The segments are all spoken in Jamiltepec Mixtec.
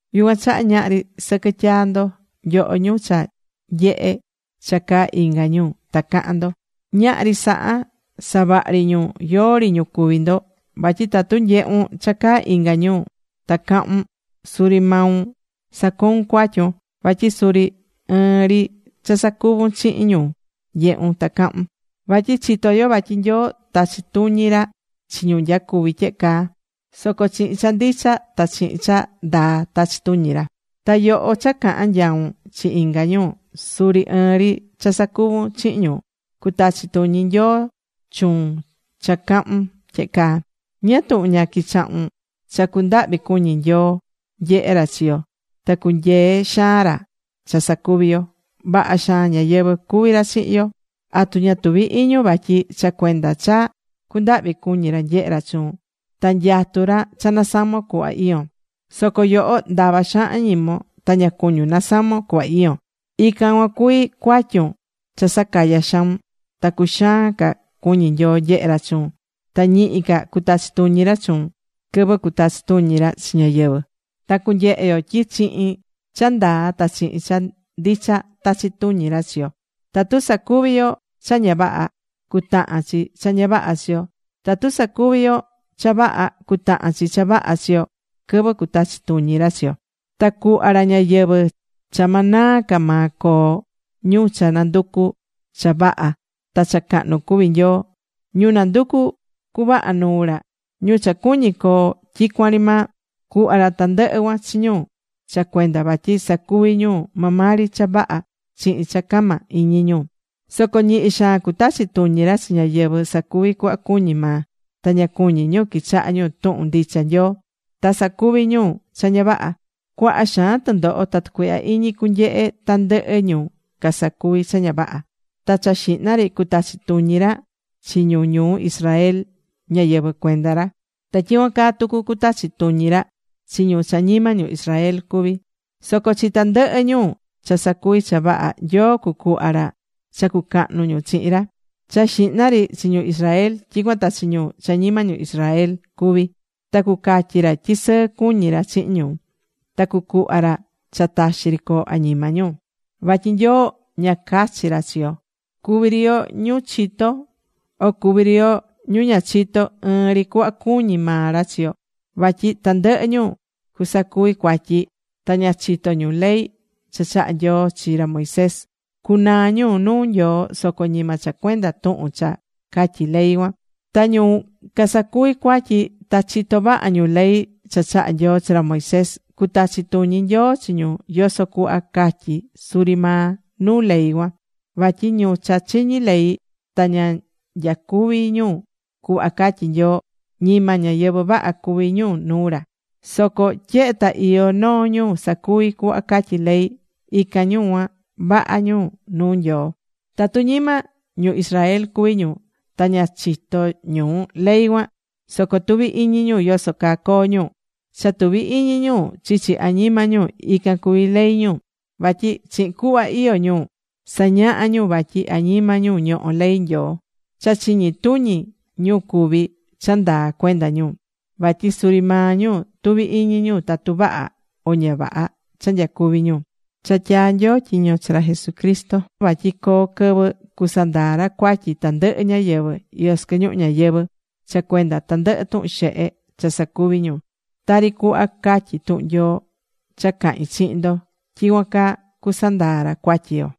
Yucuan chaha ñahri sɨquɨ tyaá ndo, nyoho ñu cha nyehé cha caá inga ñu ta cahán ndo. Ñahri saha, savahri ñu, yóó ri ñu cuví ndo. Vatyi tatu nyehún cha caá inga ñu ta cahún, suri maun sacoún cuatyun. Vatyi suri ɨɨn ri cha sacuvún chihin ñu nyehún ta cahún. Vatyi chitó yo vatyi Nyoo tachí tuñi ra chi ñu nyacuví tyehe caa, soco chihin cha ndicha ta chihin cha ndaa, tachí tuñi ra. Ta yoho cha cahán nyaun chi inga ñu, suri ɨɨn ri cha sacuvún chihin ñu. Cutachi tuñi Nyoo chuun cha cahún tyehe caa. ¿Ñáá tuhun ña quichahún cha cundahvi cuñí Nyoo nyehé ra chi yo ta cunyeé xaan ra cha sacuví yo? Vaha xaan ñáyɨvɨ cuví ra chihin yo. ¿Atu ña tuví iñun vatyi cha cuenda cha cundahvi cuñi ra nyehé ra chuun, ta nyatú ra cha nasamon cuhva iyón? Soco yoho ndava xaan añimon. Ta ña cuñún nasamon cuhva iyón. Ican cuan cuví cuatyun cha sacayá xaun, ta cuxaan ca cuñí Nyoo nyehé ra chuun ta ñihi ca cutachi tuñi ra chuun quɨvɨ cutachi tuñi ra chi ñáyɨvɨ. Ta cunyehe yo tyi chihin cha ndaa ta chihin cha ndicha tachí tuñi ra chi yo. Tatu sacuví yo cha ña vaha, cutahan chi cha ña vaha chi yo. Tatu sacuví yo cha vaha cutahan chi cha vaha chi yo quɨvɨ cutachi tuñi ra chi yo. Ta cuhva ra ñayɨvɨ̱ cha ma naa ca maa coo ñu cha nanducú cha vaha ta cha cahnu cuví Nyoo, ñu nanducú cuvaha nuu ra, ñu cha cuñí coo tyicuan ri maa. Cuhva ra tandɨhɨ cuan chi ñu cha cuenda vatyi sacuví ñu maa maa ri cha vaha chihin cha cama iñi ñu. Soco ñihi xaan cutachi tuñi ra chi ñáyɨvɨ sacuví cuhva cuñí maa, ta ña cuñí ñu quichaha ñu tuhun ndicha Nyoo, ta sacuví ñu cha ña vaha. Cuaha xaan tɨndoho ta tucuihya iñi cunyehe tandɨhɨ ñu casacuví cha ña vaha. Ta cha xihna ri cutachi tuñi ra chi ñu ñuu Israel, ñáyɨvɨ cuenda ra. Ta tyicuan caa tucu cutachi tuñi ra chi ñu cha ñima ñu Israel cuví. Soco chi tandɨhɨ ñu cha sacuví cha vaha, Nyoo cucuhva ra cha cucahnu ñu chihin ra, cha xihna ri chi ñu Israel, tyicuan ta chi ñu cha ñima ñu Israel cuví. Ta cucatyi ra tyi sɨɨ cuñi ra chihin ñu. Ta cucuhva ra cha taxi ri coo añima ñu. Vatyi Nyoo ña cachí ra chi yo. Cuví ri yo ñu chitó, o cuví ri yo ñu ña chitó, ɨɨn ri cuhva cuñí maa ra chi yo. Vatyi tandɨhɨ ñu casacuví cuatyi ta ña chitó ñu ley cha chaha̱ Nyoo chi ra Moisés, cunaa ñu nuu Nyoo soco ñima cha cuenda tuhun cha catyí ley cuan. Ta ñu casacuví cuatyi ta chitó vaha ñu ley cha chaha̱ Nyoo chi ra Moisés, cutachi tuñi Nyoo chi ñu yoso cuhva catyí suri maa nuu ley cuan. Vatyi ñu cha chiñí ley, ta ña nyacuví ñu cuhva catyí Nyoo, ñima ñáyɨvɨ vaha cuví ñu nuu ra. Soco tyehe ta iyó noo ñu sacuví cuhva catyí ley, ican ñu cuan, vaha ñu nuu Nyoo. Tatu ñima ñu Israel cuví ñu ta ña chitó ñu ley cuan, soco tuví iñi ñu yoso caa coo ñu; cha tuví iñi ñu chichi añima ñu, ican cuví ley ñu. Vatyi chihin cuhva iyó ñu, sañahá ñu vatyi añima ñu ñohó ley Nyoo. Cha chiñi tuñi ñu cuví cha ndaa cuenda ñu, vatyi suri maa ñu tuví iñi ñu tatu vaha o ña vaha cha nyacuví ñu. Cha tyaa̱ Nyoo tyiño chi ra Jesucristo vatyi coo quɨvɨ cusandaa ra cuatyi tandɨhɨ ñáyɨvɨ iyó sɨquɨ ñuhu ñayɨvɨ̱ cha cuenda tandɨhɨ tuhun xehe cha sacuvi̱ ñu. Tari cuhva catyí tuhun Nyoo cha cahín chihin ndo, tyicuan caa cusandaa ra cuatyi yo.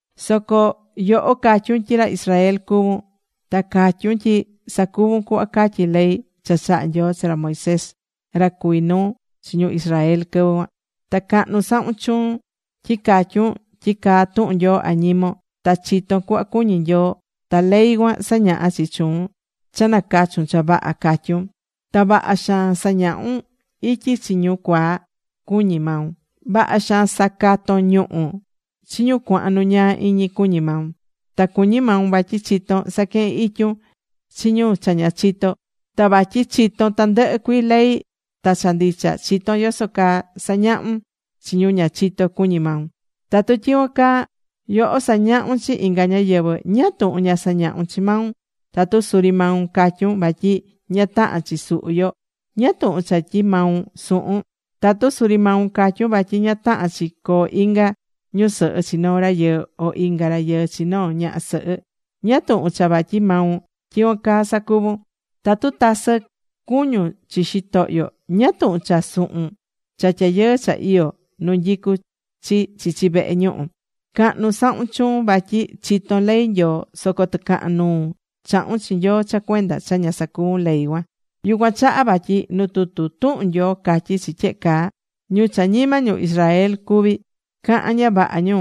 Soco yoho catyún tyi ra Israel cuvún. Ta catyún tyi sacuvún cuhva catyí ley cha chaha̱ Nyoo chi ra Moisés, ra cuví nuu chi ñu Israel quɨvɨ cuan. Ta cahnu sahún chuun tyi catyún tyi caá tuhun Nyoo añimon. Ta chitón cuhva cuñí Nyoo ta ley cuan sañahá chi chuun cha nacachún cha vaha, catyún. Ta vaha xaan sañahún ityi chi ñu cuaa, cuñí maun. Vaha xaan sacatón ñuhú chi ñu cuahan nu ñaa iñi, cuñí maun. Ta cuñí maun vatyi chitón saquehen ityun chi ñu cha ña chitó. Ta vatyi chitón tandɨhɨ cuii ley ta cha ndicha, chitón yoso caa sañahun chi ñu ña chitó, cuñí maun. Tatu tyicuan caa yoho sañahún chi inga ñáyɨvɨ, ¿ñáá tuhun ña sañahún chi maun? Tatu suri maun catyún vatyi ña tahán chi suhu yo, ¿ñáá tuhun cha tyi maun suhún? Tatu suri maun catyún vatyi ña tahán chi coo inga ñusɨhɨ chi noo rayɨɨ, o inga rayɨɨ chi noo ñaha sɨhɨ, ¿ñáá tuhun cha vatyi maun tyicuan caa sacuvún? Tatu tasɨ cuñún chi xitohyo, ¿ñáá tuhun cha suhún cha tyayɨɨ cha iyó nu nyicú chi chichi vehe ñuhu? Cahnu sahún chuun vatyi chitón ley Nyoo, soco tɨcahan nuu chahún chi Nyoo cha cuenda cha ña sacuvún ley cuan. Yucuan chaha vatyi nu tutu tuhun Nyoo catyí chi tyehe caa: “Ñu cha ñima ñu Israel cuví, cahán ña vaha ñu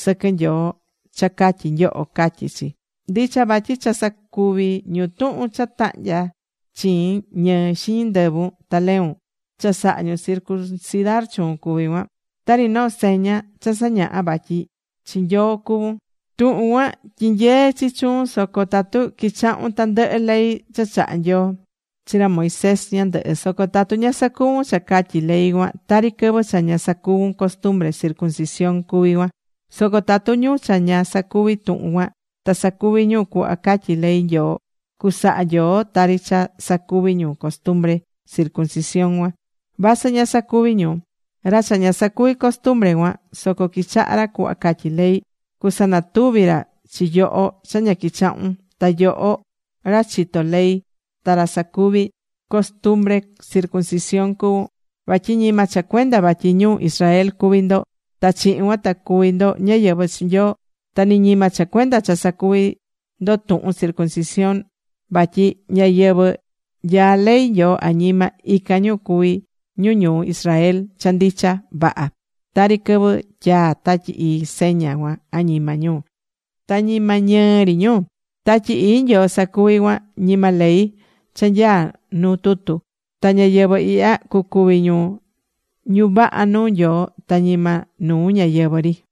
sɨquɨ Nyoo cha catyí nyoho”, catyí chi. Ndicha vatyi cha sacuvi̱ ñu tuhun cha tahnya̱ chiin ñɨɨ xiñi ndɨvun ta leun, cha saha̱ ñu circuncidar chuun cuví cuan, tari noo seña cha sañahá vatyi ñáyɨvɨ chi Nyoo cuvún. Tuhun cuan tyinyeé chi chuun soco tatu quichahún tandɨhɨ ley cha chaha̱ Nyoo chi ra Moisés ñandɨhɨ. Soco tatu ña sacuvún cha catyí ley cuan, tari quɨvɨ cha ña sacuvu̱n costumbre circuncisión cuví cuan. Soco tatu ñu cha ña sacuví tuhun cuan, ta sacuví ñu cuhva catyí ley Nyoo, cusaha Nyoo tari cha sacuvi̱ ñu costumbre circuncisión cuan, vasɨ ña sacuvi̱ ñu. Ra cha ña sacuvi̱ costumbre cuan, soco quichahá ra cuhva catyí ley, cusanatuvi ra chi yoho cha ña quichahún, ta yoho, ra chitó ley ta ra sacuvi̱ costumbre circuncisión cuvún. Vatyi ñima cha cuenda vatyi ñu Israel cuví ndo ta chihin cuan ta cuví ndo ñáyɨvɨ chi Nyoo. Ta ni ñima cha cuenda cha sacuvi̱ ndo tuhun circuncisión. Vatyi ñáyɨvɨ nyaá ley Nyoo añima, ican ñu cuví ñu ñu Israel cha ndicha vaha. Tari quɨvɨ tyaa̱ Tatyi Ii seña cuan añima ñu, ta ñima ñɨɨ ri ñu. Tatyi Ii Nyoo sacuví cuan, ñima ley cha nyaá nuu tutu. Ta ñáyɨvɨ ihya cucuvi ñu ñu vaha nuu Nyoo, ta ñima nuu ñáyɨvɨ ri.